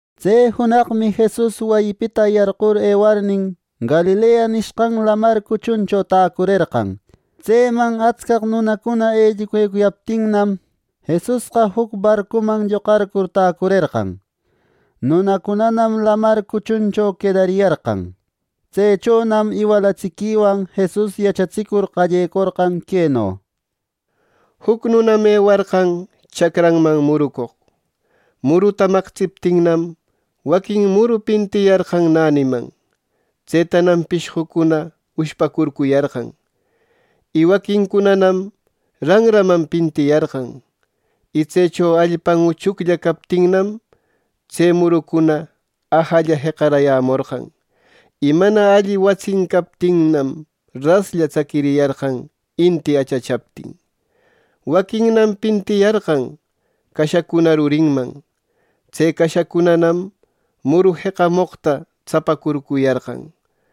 Tse junaqmi Jesus wayipita yarqur ewarnin, Galilea nishqan Lamar cuchuncho täcurerqan. Tseman atscaq nunacuna elluquecuyaptinnam Jesusqa juc barcuman lloqarcur täcurerqan. Nunacunanam lamar cuchuncho quedariyarqan. Tsechonam iwalatsiquicunawan Jesus yachatsicur qallecorqan queno: “Juc nunam ewarqan chacranman murucoq. Muruta maqtsiptinnam, waquin muru pintiyarqan näniman. Tsetanam pishqucuna ushpacurcuyarqan. Y waquincunanam ranraman pintiyarqan. Y tsecho allpan uchuclla captinnam, tse murucuna ajalla jeqarayämorqan. Y mana alli watsin captinnam, raslla tsaquiriyarqan inti achachaptin. Waquinnam pintiyarqan cashacuna rurinman. Tse cashacunanam muru jeqamoqta tsapacurcuyarqan.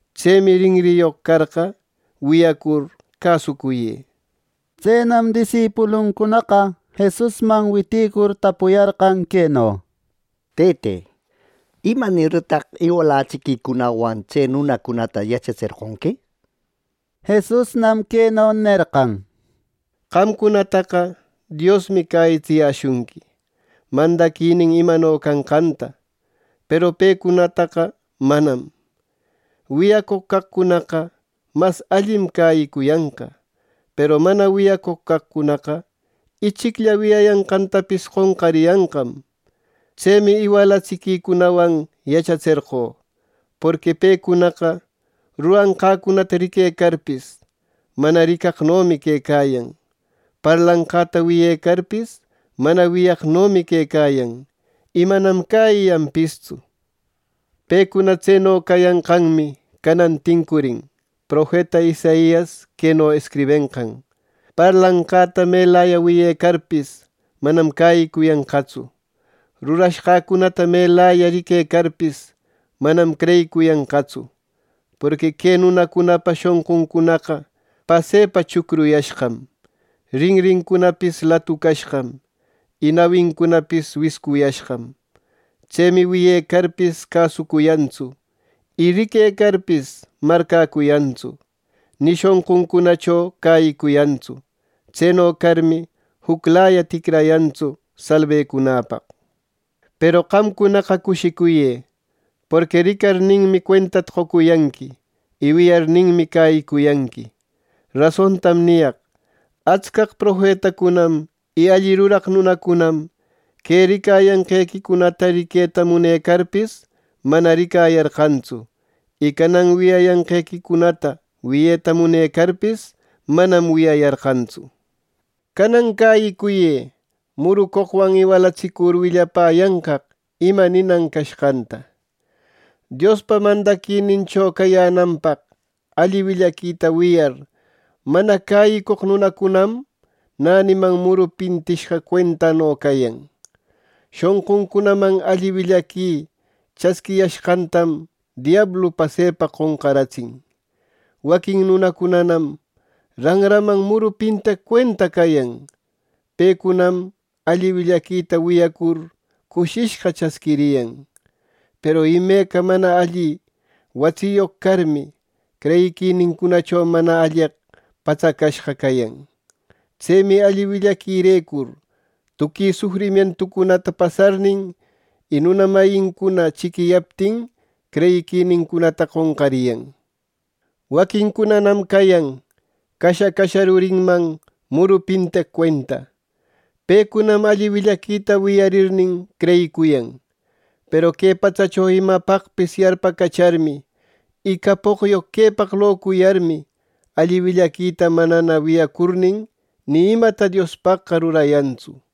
¡Tsemi rinriyoq carqa, wiyacur cäsucuyë!” Tsenam disipuluncunaqa Jesusman witïcur tapuyarqan queno: —Tëte, ¿Imanirtaq iwalatsiquicunawan tse nunacunata yachatserqonqui? —nir. Jesusnam queno nerqan: “Qamcunataqa Diosmi cäyitsiyäshunqui mandaquinin imano canqanta; peru pecunataqa manam. Wiyacoq caqcunaqa mas allim cäyicuyanqa, peru mana wiyacoq caqcunaqa, ichiclla wiyayanqantapis qonqariyanqam. Tsemi iwalatsiquicunawan yachatserqö. Porqui pecunaqa ruranqäcunata riquecarpis, mana ricaqnomi quecayan; parlanqäta wiyecarpis, mana wiyaqnomi quecayan, y manam cäyiyanpistsu. Pecuna tseno cayanqanmi canan tincurin profeta Isaias queno escribenqan: ‘Parlanqäta melaya wiyecarpis manam cäyicuyanqatsu. Rurashqancunata melaya riquecarpis manam creyicuyanqatsu. Porqui que nunacunapa shonquncunaqa pasepa chucruyashqam. Rinrincunapis latucashqam, y nawincunapis wiscuyashqam. Tsemi wiyecarpis cäsucuyantsu, y riquecarpis marcäcuyantsu. Ni shonquncunacho cäyicuyantsu. Tseno carmi juclaya ticrayantsu, salbecunäpaq.’ “Peru qamcunaqa cushicuyë. Porqui ricarninmi, cuentata qocuyanqui; y wiyarninmi cäyicuyanqui. Rasontam niyaq: Atscaq profetacunam y alli ruraq nunacunam que ricayanqequicunata riqueta munecarpis, manam ricayarqantsu; y canan wiyayanqequicunata wiyeta munecarpis, manam wiyayarqantsu. “Canan cäyicuyë murucoqwan iwalatsicur willapäyanqaq ima ninan cashqanta: Diospa mandaquinincho cayänanpaq alli willaquita wiyar mana cäyicoq nunacunam, näniman muru pintishqa cuentano cayan. Shonquncunaman alli willaqui chasquiyashqantam diablu pasepa qonqaratsin. Waquin nunacunanam ranraman muru pinteq cuenta cayan. Pecunam alli willaquita wiyacur cushishqa chasquiriyan. Peru imeca mana alli watsiyoq carmi, creyiquinincunacho mana alleqpa patsacashqa cayan. Tsemi alli willaquirecur tuqui sufrimientucunata pasarnin, y nuna mayincuna chiquiyaptin creyiquinincunata qonqariyan. Waquincunanam cayan casha, casha rurinman muru pinteq cuenta. Pecunam alli willaquita wiyarirnin creyicuyan; peru que patsacho imapaqpis yarpacacharmi y capoqyoq quepaq locuyarmi, alli willaquita manana wiyacurnin, ni imata Diospaqqa rurayantsu.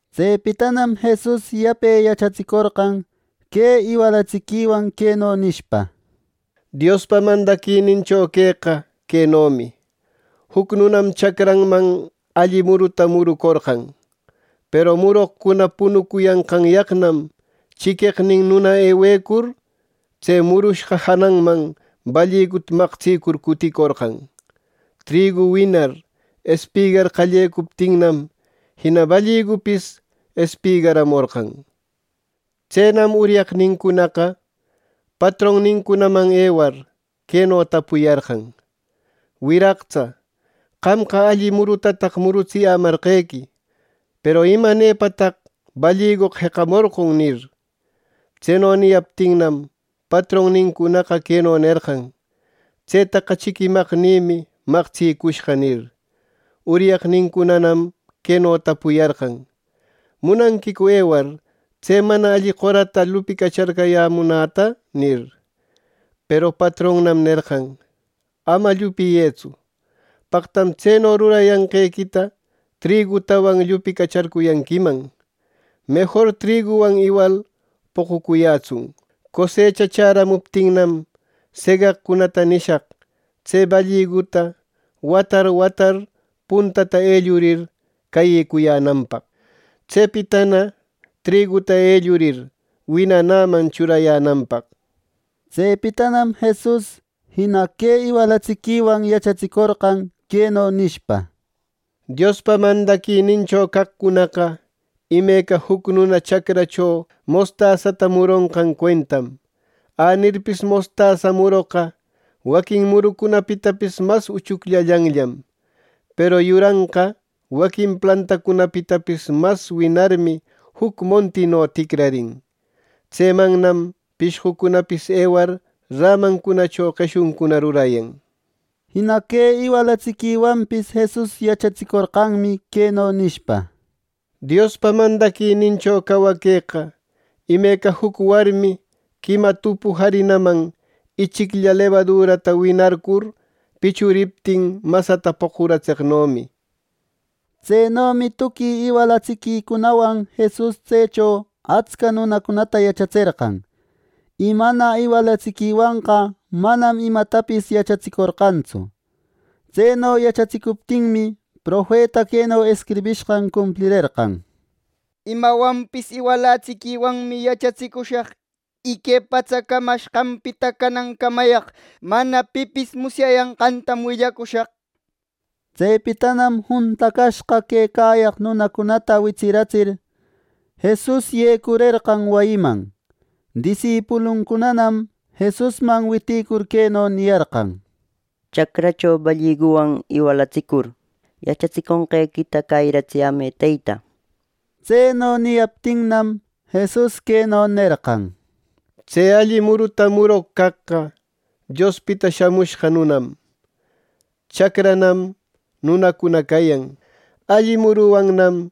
Tsepitanam Jesus yape yachatsicorqan que iwalatsiquiwan queno nishpa: “Diospa mandaquinincho queqa quenomi: Juc nunam chacranman alli muruta murucorqan. Peru muroqcuna punucuyanqanyaqnam, chiqueqnin nuna ewecur, tse murushqa jananman balliguta maqtsicur cuticorqan. Trigu winar espigar qallecuptinnam, jina balligupis espigaramorqan. Tsenam uryaqnincunaqa patronnincunaman ewar, queno tapuyarqan: ‘Wiraqtsa, qamqa alli murutataq murutsiyämarqequi, peru ¿imanepataq balligoqa jeqamorqon?’ nir. Tseno niyaptinnam, patronnincunaqa queno nerqan: ‘Tsetaqa chiquimaqnïmi maqtsicushqa’ nir. Uryaqnincunanam queno tapuyarqan: ‘¿Munanquicu ewar tse mana alli qorata llupicacharcuyänäta?’ nir. Peru patronnam nerqan: ‘Ama llupiyëtsu. Paqtam tseno rurayanqequita trigutawan llupicacharcuyanquiman. Mejor triguwan iwal poqucuyätsun. Cosecha chäramuptinnam, segaqcunata nishaq tse balliguta watar, watar puntata ellurir cayecuyänanpaq. Tsepitana trigüta ellurir winanäman churayänanpaq’” nir. Tsepitanam Jesus, jina que iwalatsiquiwan yachatsicorqan, queno nishpa: “Diospa mandaquinincho caqcunaqa imeca juc nuna chacrancho mostasata muronqan cuentam. Anirpis mostasa muroqa waquin murucunapitapis mas uchucllallanllam; peru yuranqa, waquin plantacunapitapis mas winarmi juc montino ticrarin. Tsemannam pishqucunapis ewar rämancunacho qeshuncuna rurayan” nir. Jina que iwalatsiquiwanpis Jesus yachatsicorqanmi queno nishpa: “Diospa mandaquinincho cawaqueqa imeca juc warmi quima tupu jarinaman ichiclla lebadurata winarcur pichuriptin masata poqucaratseqnomi.” Tsenomi tuqui iwalatsiquicunawan Jesus tsecho atsca nunacunata yachatserqan. Y mana iwalatsiquiwanqa manam imatapis yachatsicorqantsu. Tseno yachatsicuptinmi, profeta queno escribishqan cumplirerqan: “Imawanpis iwalatsiquiwanmi yachatsicushaq y que patsa camacashqanpita canancamayaq mana pipis musyayanqantam willacushaq”, nenqan. Tsepitanam juntacashqa quecayaq nunacunata witsiratsir, Jesus yecurerqan wayiman. Disipuluncunanam Jesusman witïcur queno niyarqan: “Chacracho balliguwan iwalatsicur yachatsiconqequita cäyiratsiyämë, Teyta” nir. Tseno niyaptinnam, Jesus queno nerqan: “Tse alli muruta muroq caqqa Diospita Shamushqa Nunam. Chacranam nunacuna cayan. Alli muruwannam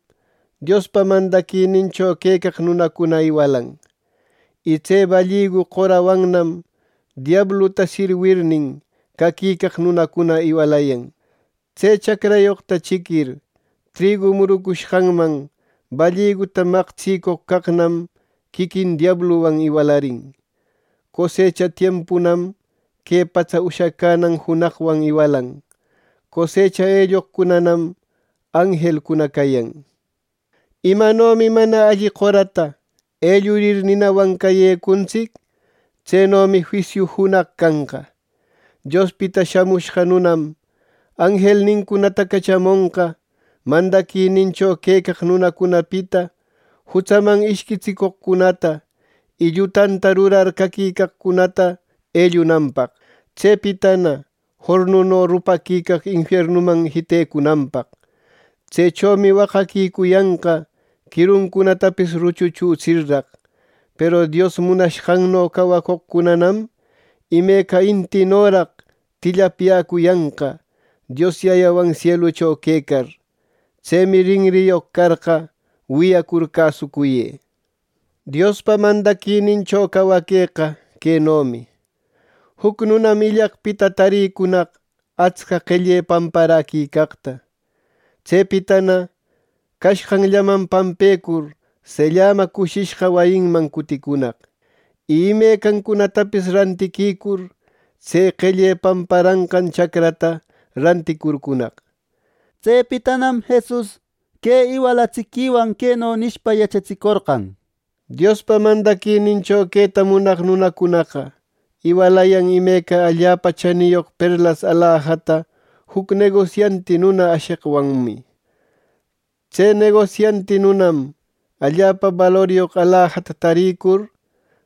Diospa mandaquinincho quecaq nunacuna iwalayan. Y tse balligu qorawannam diabluta sirwirnin, caquicaq nunacuna iwalayan. Tse chacrayoqta chiquir, trigu murucushqanman balliguta maqtsicoq caqnam, quiquin diabluwan iwalarin. Cosecha tiempunam que patsa ushacänan junaqwan iwalan. Cosecha elloqcunanam anjelcuna cayan. Imanomi mana alli qorata elluricur ninawan cayecuntsic. Tsenomi juisiu junaq canqa. Diospita Shamushqa Nunam, anjelnincunata cachamonqa mandaquinincho quecaq nunacunapita jutsaman ishquitsicoqcunata, y llutanta rurar caquicaqcunata ellunanpaq, tsepitana jornuno rupaquicaq infiernuman jitecunanpaq. Tsechomi waqaquicuyanqa quiruncunatapis ruchuchutsirraq. Peru Dios munashqanno cawacoqcunanam imeca intinoraq tillapyäcuyanqa, Dios Yayawan sielucho quecar. ¡Tsemi rinriyoq carqa, wiyacur cäsucuyë!” “Diospa mandaquinincho cawaqueqa quenomi: Juc nunam illaqpita tarïcunaq atsca qelle pamparaquicaqta. Tsepitana cashqanllaman pampecur sellama cushishqa wayinman cuticunaq, y imecancunatapis rantiquicur tse qelle pamparanqan chacrata ranticurcunaq.” Tsepitanam Jesus que iwalatsiquiwan queno nishpa yachatsicorqan: “Diospa mandaquinincho queta munaq nunacunaqa iwalayan imeca allapa chaniyoq perlas alajata juc negosianti nuna asheqwanmi. Tse negosianti nunam allapa baloryoq alajata tarïcur,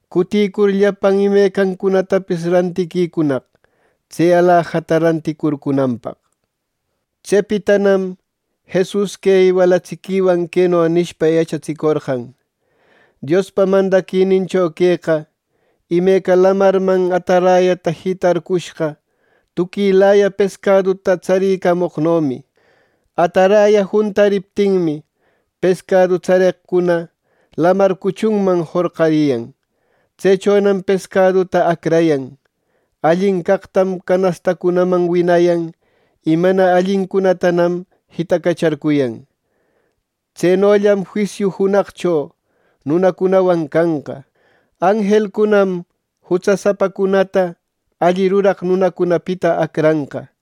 cuticur llapan imecancunatapis rantiquicunaq tse alajata ranticurcunanpaq.” Tsepitanam Jesus que iwalatsiquiwan queno nishpa yachatsicorqan: “Diospa mandaquinincho queqa imeca lamarman atarayata jitarcushqa tuquilaya pescaduta tsarïcamoqnomi. Ataraya juntariptinmi, pescadu tsareqcuna lamar cuchunman jorqariyan. Tsechonam pescaduta acrayan. Allin caqtam canastancunaman winayan, y mana allicunatanam jitacacharcuyan. Tsenollam juisiu junaqcho nunacunawan canqa: Anjelcunam jutsa sapacunata alli ruraq nunacunapita acranqa.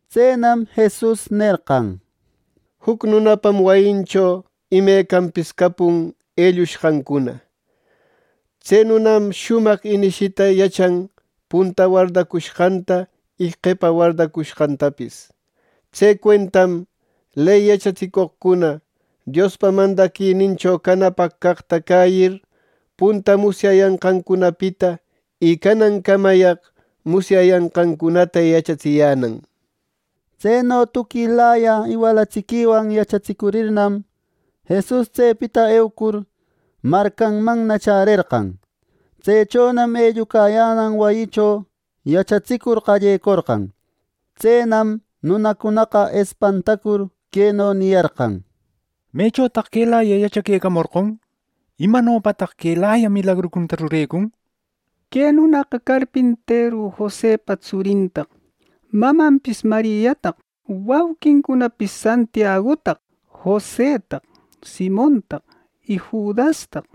Tsenam Jesus nerqan: —Juc nunapam wayincho imecanpis capun ellushqancuna. Tse nunam shumaq inishita yachan punta wardacushqanta y qepa wardacushqantapis. Tse cuentam ley yachatsicoqcuna Diospa mandaquinincho canapaq caqta cäyir punta musyayanqancunapita y canancamayaq musyayanqancunata yachatsiyänan. Tseno tuquilaya iwalatsiquiwan yachatsicurirnam, Jesus tsepita eucur, marcanmanna chärerqan. Tsechonam ellucayänan wayicho yachatsicur qallecorqan. Tsenam nunacunaqa espantacur queno niyarqan: —¿Mechotaq quelayaqa yachaquecamorqon? ¿Imanopataq quelaya milagrucunata rurecun? ¡Que nunaqa carpinteru Josepa tsurintaq; mamanpis Mariataq, wauqincunapis Santiagutaq, Josetaq, Simontaq y Judastaq!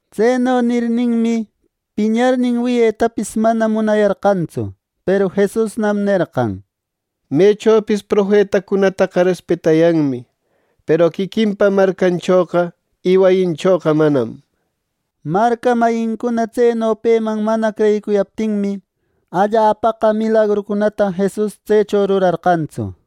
Tseno nirninmi, piñarnin wiyetapis mana munayarqantsu. Peru Jesusnam nerqan: —Mechopis profetacunataqa respetayanmi, peru quiquinpa marcanchoqa y wayinchoqa manam —nir. Marca mayincuna tseno peman mana creyicuyaptinmi, allapaqa milagrucunata Jesus tsecho rurarqantsu.